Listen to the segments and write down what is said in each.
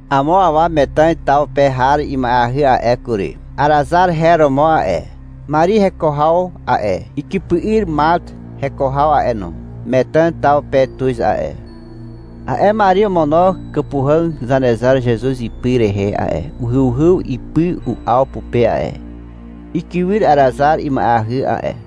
Amo awa Metàn taw pe har ima'eahy a'e kury. Arazar her romo a'e. Mari heko haw a'e, ikypy'yr Mart heko haw a'e no, Metàn taw pe tuz a'e. (A'e Mari omono kàpuhàg Zanezar Zezuz ipy rehe a'e, uhyuhyw ipy u'aw pupe a'e. Ikywyr Arazar ima'eahy a'e).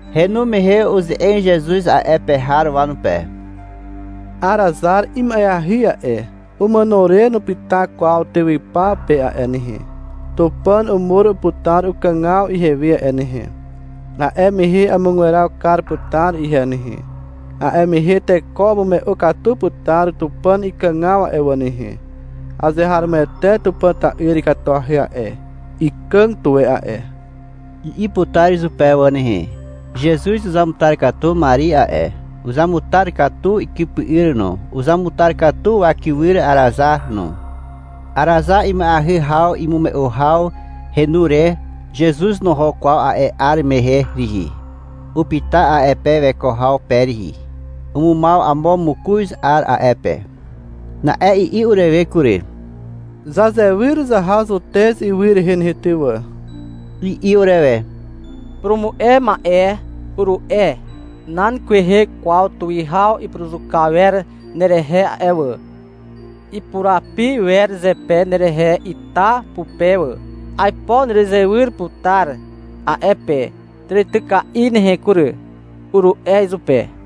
Henu mehe uze'eg Zezuz a'e pe har wanupe. — Arazar ima'eahy a'e. Umàno re nupyta kwaw tywypaw pe a'e nehe, Tupàn umur putar ukàgaw ihewe a'e nehe. A'e mehe amugweraw kar putar ihe nehe. A'e mehe teko umume'u katu putar Tupàn ikàgaw a'e wà nehe. — Azeharomoete Tupàn ta'yr ikatuahy a'e, ikàg tuwe a'e, i'i putar izupe wà nehe. Zezuz uzamutar katu Mari a'e. Uzamutar katu ikypy'yr no. Uzamutar wakywyr Arazar no. Arazar ima'eahy haw imume'u haw henu re, Zezuz noho kwaw a'e 'ar mehe rihi. Upyta a'e pe weko haw pe rihi. Umumaw amo mokoz 'ar a'e pe. Na'e i'i urewe kury. — Zazewyr zaha Zutez ywy rehe nehe ty wà, i'i urewe. — Purumu'e ma'e, uru'e. — Nan kwehe kwaw tuwihaw ipuruzuka wer awer nerehe a'e wà. Ipurapi wer zepe nerehe ita pupe wà. Aipo erezewyr putar a'e pe tàrityka'i nehe kury, uru'e izupe.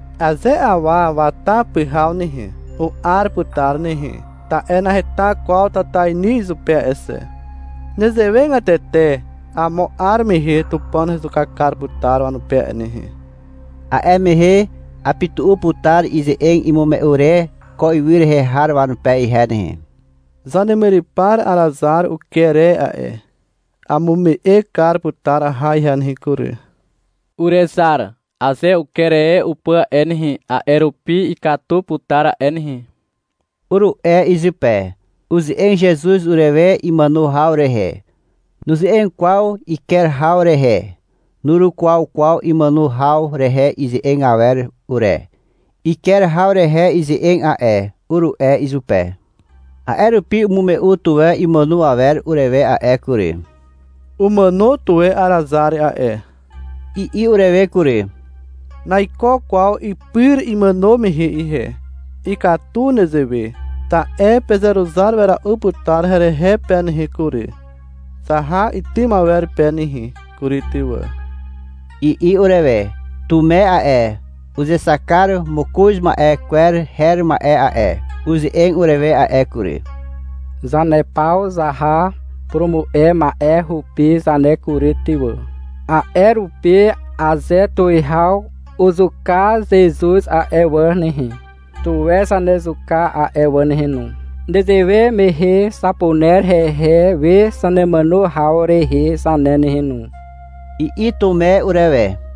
Aze awa wata pyhaw nehe, u'ar putar nehe. Ta'e naheta kwaw tatainy izupe a'e xe. Nezewegatete amo 'ar mehe Tupàn hezuka kar putar wanupe a'e nehe. A'e mehe apytu'u putar ize'eg imume'u re ko ywy rehe har wanupe ihe nehe. Zanemyrypar Arazar uker e a'e. Amume'e kar putar aha ihe nehe kury. — Urezar. Aze uker e upà a'e nehe, a'e rupi ikatu putar a'e nehe, uru'e izupe. Uze'eg Zezuz urewe imàno haw rehe. Nuze'eg kwaw iker haw rehe. Nurukwaw kwaw imàno haw rehe ize'eg awer ure. — Iker haw rehe ize'eg a'e, uru'e izupe. A'e rupi umume'u tuwe imàno awer urewe a'e kury. — Umàno tuwe Arazar a'e, i'i urewe kury. — Naiko kwaw ipyr imàno mehe ihe. Ikatu nezewe. Ta'e pezeruzar wera'u putar herehe pe nehe kury. Zaha itym awer pe nehe kury ty wà, i'i urewe. Tume a'e, uzexak kar mokoz ma'e kwer her ma'e a'e, uze'eg urewe a'e kury. — Zane paw zaha purumu'e ma'e hupi zane kury ty wà, a'e rupi aze tuwihaw uzuka Zezuz a'e wà nehe, tuwe zanezuka a'e wà nehe no. Nezewe mehe zapuner hehe we zanemàno haw rehe zane nehe no, i'i Tume urewe.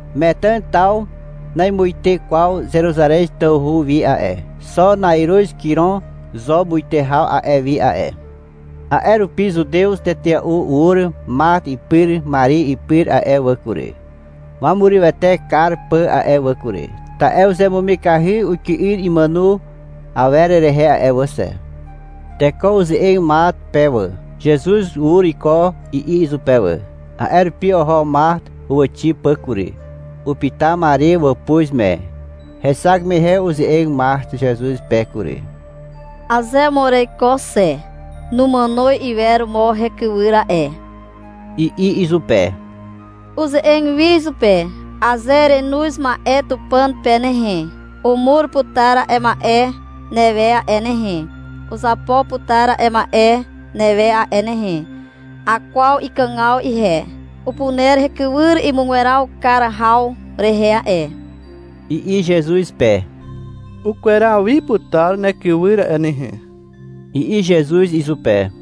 Metàn taw namuite kwaw Zeruzarez tawhu wi a'e. Xo na'iruz kirom zo muite haw a'e wi a'e. A'e rupi Zutew tetea'u ur Mart ipyr Mari ipyr a'e wà kury, wamurywete kar pà a'e wà kury. Ta'e uzemumikahy ukywyr imàno awer rehe a'e wà xe. Teko uze'eg Mart pe wà. — Zezuz ur iko, i'i izupe wà. A'e rupi oho Mart huwàxi pà kury. Upyta Mari wàpuz me. Hexak mehe uze'eg Mart Zezuz pe kury. — Aze mo ereiko xe, numàno iwer mo hekywyr a'e, i'i izupe. Uze'eg wi izupe. — Aze erenoz ma'e Tupàn pe nehe, umur putar a'e ma'e newe a'e nehe, uzapo putar a'e ma'e newe a'e nehe. Akwaw ikàgaw ihe. Upuner hekywyr imugweraw kar haw rehe a'e, i'i Zezuz pe. — Ukweraw wi putar nekywyr a'e nehe, i'i Zezuz izupe.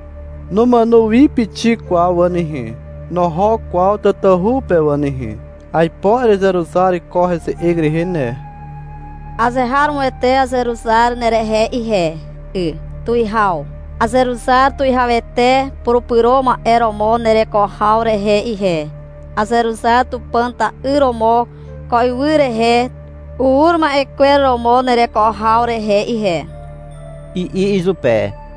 Numàno wi pixik kwaw wà nehe. (Noho kwaw tatahu pe wà nehe.) Aipo erezeruzar ko heze'eg rehe ne. — Azeharomoete azeruzar nerehe ihe 'y, tuwihaw. Azeruzar Tuwihawete Purupyro Ma'e romo nereko haw rehe ihe, azeruzar Tupàn ta'yr romo ko ywy rehe ur ma'e kwer romo nereko haw rehe ihe, i'i izupe.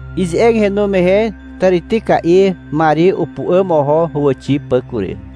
Ize'eg henu mehe tàrityka'i Mari upu'àm oho huwàxi pà kury.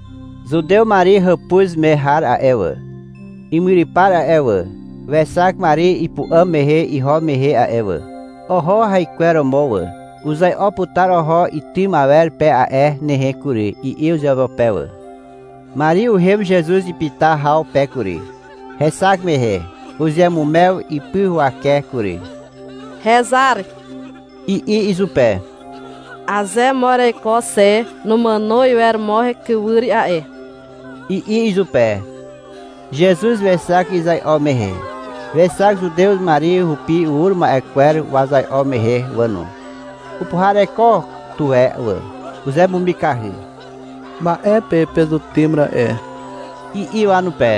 Zutew Mari hàpuz me har a'e wà, imyrypar a'e wà, wexak Mari ipu'àm mehe iho mehe a'e wà. Oho haikweromo wà. — Uzai'o putar oho itym awer pe a'e nehe kury, i'i uzeupeupe wà. Mari uhem Zezuz ipyta haw pe kury. Hexak mehe, uzeamumew ipy huwake kury. — Hezar, i'i izupe. — Aze mo ereiko xe, numàno iwer mo hekywyr a'e, i'i izupe. Zezuz wexak izai'o mehe. Wexak Zutew Mari hupi ur ma'e kwer wazai'o mehe wà no. Upuhareko tuwe wà. Uzemumikahy. — Ma'e pe pezutym ra'e, i'i wanupe.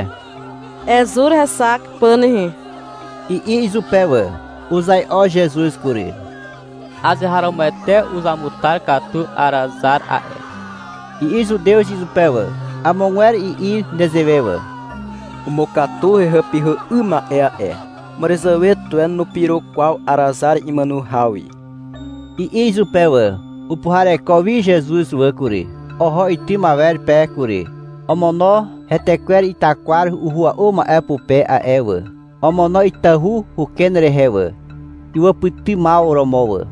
— Ezur hexak pà nehe, i'i izupe wà. Uzai'o Zezuz kury. — Azeharomoete uzamutar katu Arazar a'e, i'i Zutew izupe wà. Amogwer i'i nezewe wà. — Umukatu hehàpyhà 'ym ma'e a'e. Màràzàwe tuwe nupyro kwaw Arazar imàno haw wi, i'i izupe wà. Upuhareko wi Zezuz wà kury. Oho itym awer pe kury. (Omono hetekwer itakwar uhua'u ma'e pupe a'e wà. Omono itahu uken rehe wà, iwàpytymaw romo wà.)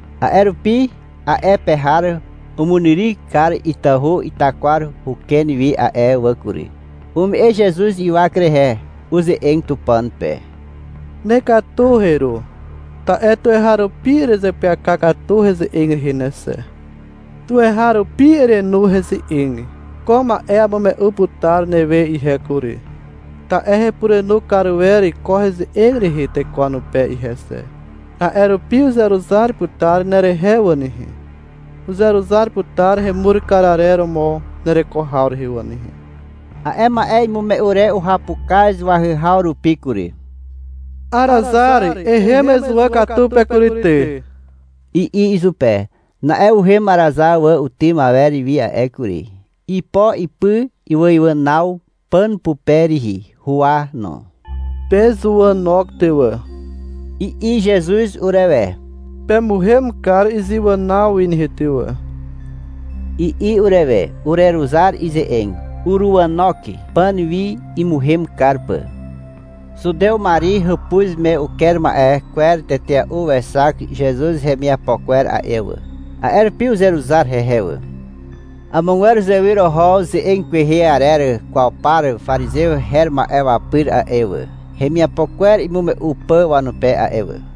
A'e rupi a'e pe har umunyryk kar itahu itakwar huken wi a'e wà kury. Ume'e Zezuz ywak rehe. Uze'eg Tupàn pe. — Nekatu heru, ta'e tuweharupi erezeapyaka katu heze'eg rehe xe. Tuweharupi erenu heze'eg. Ko ma'e amume'u putar newe ihe kury, ta'e hepurenu kar wer ko ze'eg rehe teko wanupe ihe xe. A'e rupi uzeruzar putar nerehe wà nehe. Uzeruzar putar hemur kar arer romo nereko haw rehe wà nehe. A'e ma'e imume'u re uhapukaz wahyhaw rupi kury. — Arazar, ehem ezuwà katu pe kury ty, i'i izupe. Na'e uhem Arazar wà utym awer wi a'e kury. Ipo ipy iwàiwànaw pàn pupe rihi, huwa no. — Pezuwànok ty wà, i'i Zezuz urewe. — Pemuhem kar izewànaw wi nehe ty wà, i'i urewe. (Ureruzar ize'eg. Uruzuwànok pàn wi imuhem kar pà.) Zutew Mari hàpuz me uker ma'e kwer tetea'u wexak Zezuz hemiapo kwer a'e wà. A'e rupi uzeruzar hehe wà. Amogwer uzewyr oho ze'eg kwehe arer kwaw par parizew her ma'e wanupe a'e wà, hemiapo kwer imume'u pà wanupe a'e wà.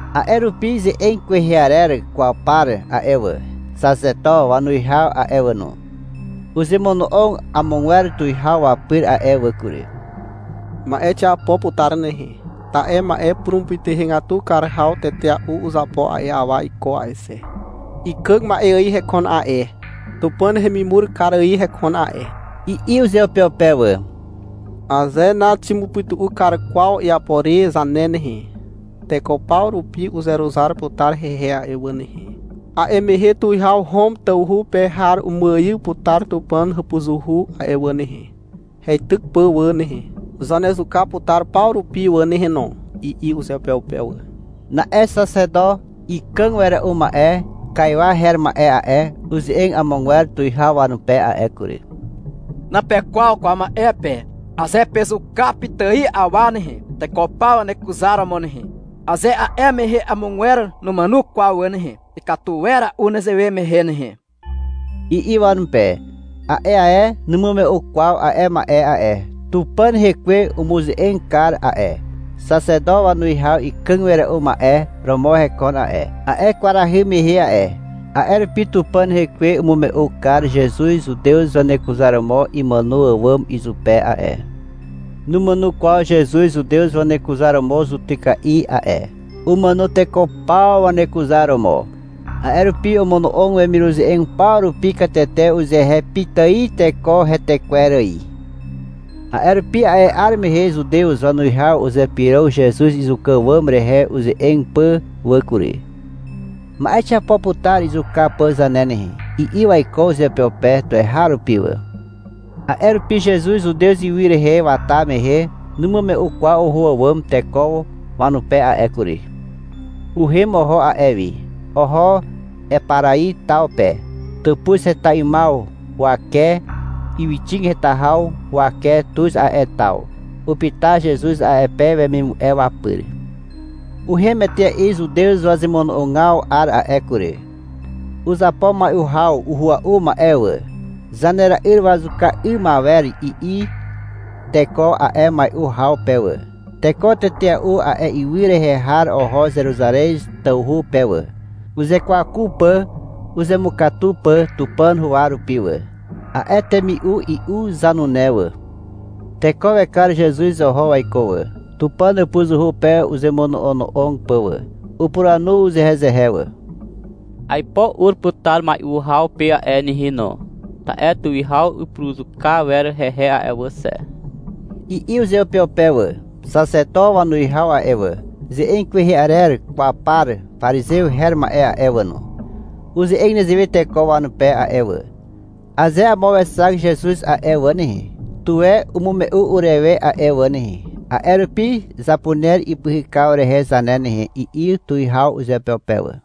A'e rupi ze'eg kwehe arer kwaw par a'e wà, xaxeto wanuwihaw a'e wà no, uzemono'og amogwer tuwihaw wapyr a'e wà kury. — Ma'e xiapo putar nehe. Ta'e ma'e purumupytuhegatu kar haw tetea'u uzapo a'e awa iko a'e xe. Ikàg ma'e ài hekon a'e, Tupàn hemimur kar ài hekon a'e, i'i uzeupeupe wà. — Aze naximupytu'u kar kwaw iapo re zane nehe, teko paw rupi uzeruzar putar hehe a'e wà nehe. A'e mehe tuwihaw Hom tawhu pe har umuaiw putar Tupàn hàpuzuhu a'e wà nehe, heityk pà wà nehe. Zanezuka putar paw rupi wà nehe no, i'i uzeupeupe wà. Na'e xaxeto ikàg wera'u ma'e Kaiwa her ma'e a'e, uze'eg amogwer tuwihaw wanupe a'e kury. — Napekwaw kwaw ma'e pe. Aze pezuka pitài awa nehe, teko paw wanekuzaromo nehe, aze a'e mehe amogwer numàno kwaw wà nehe, ikatu wera'u nezewe mehe nehe, i'i wanupe. (A'e ae numume'u kwaw a'e ma'e a'e. Tupàn rekwe umuze'eg kar a'e. Xaxeto wanuwihaw ikàg wera'u ma'e romo hekon a'e, a'e kwarahy mehe a'e. A'e rupi Tupàn rekwe umume'u kar Zezuz zutew wanekuzaromo imàno àwàm izupe a'e. Numàno kwaw Zezuz zutew wanekuzaromo zutyka'i a'e. Umàno teko paw wanekuzaromo. A'e rupi omono'og wemiruze'eg paw rupi katete uzehe pitài teko hetekwer ài.) A'e rupi a'e 'ar mehe Zutew wanuwihaw uzypyrog Zezuz izuka àwàm rehe uze'eg pà wà kury. — Ma'e xiapo putar izuka pà zane nehe, i'i waiko uzeupeupe tuweharupi wà. A'e rupi Zezuz Zutez ywy rehe wata mehe numume'u kwaw oho àwàm teko wanupe a'e kury. Uhem oho a'e wi. Oho Eparai taw pe. Tàpuz heta 'ymaw huwake ywyxig heta haw huwake tuz a'e taw. Upyta Zezuz a'e pe wemimu'e wapyr. Uhem etea'i Zutew wazemono'ogaw 'ar a'e kury. Uzapo mai'u haw uhua'u ma'e wà. Zanera'yr wazuka 'ym awer, i'i teko a'e mai'u haw pe wà. Teko tetea'u a'e ywy rehe har oho Zeruzarez tawhu pe wà, uzekwaku pà uzemukatu pà Tupàn huwa rupi wà, a'e temi'u i'u zanune wà. Teko wekar Zezuz oho waiko wà, Tupàn hàpuzuhu pe uzemono'ono'og pà wà. Upuranu uzehezehe wà. — Aipo ur putar mai'u haw pe a'e nehe no, ta'e tuwihaw ipuruzuka wer hehe a'e wà xe, i'i uzeupeupe wà. Xaxeto wanuwihaw a'e wà, ze'eg kwehe arer kwaw par parizew her ma'e a'e wà no, uze'eg nezewe teko wanupe a'e wà. — Aze amo wexak Zezuz a'e wà nehe, tuwe umume'u urewe a'e wà nehe. A'e rupi zapuner ipyhykaw rehe zane nehe, i'i tuwihaw uzeupeupe wà.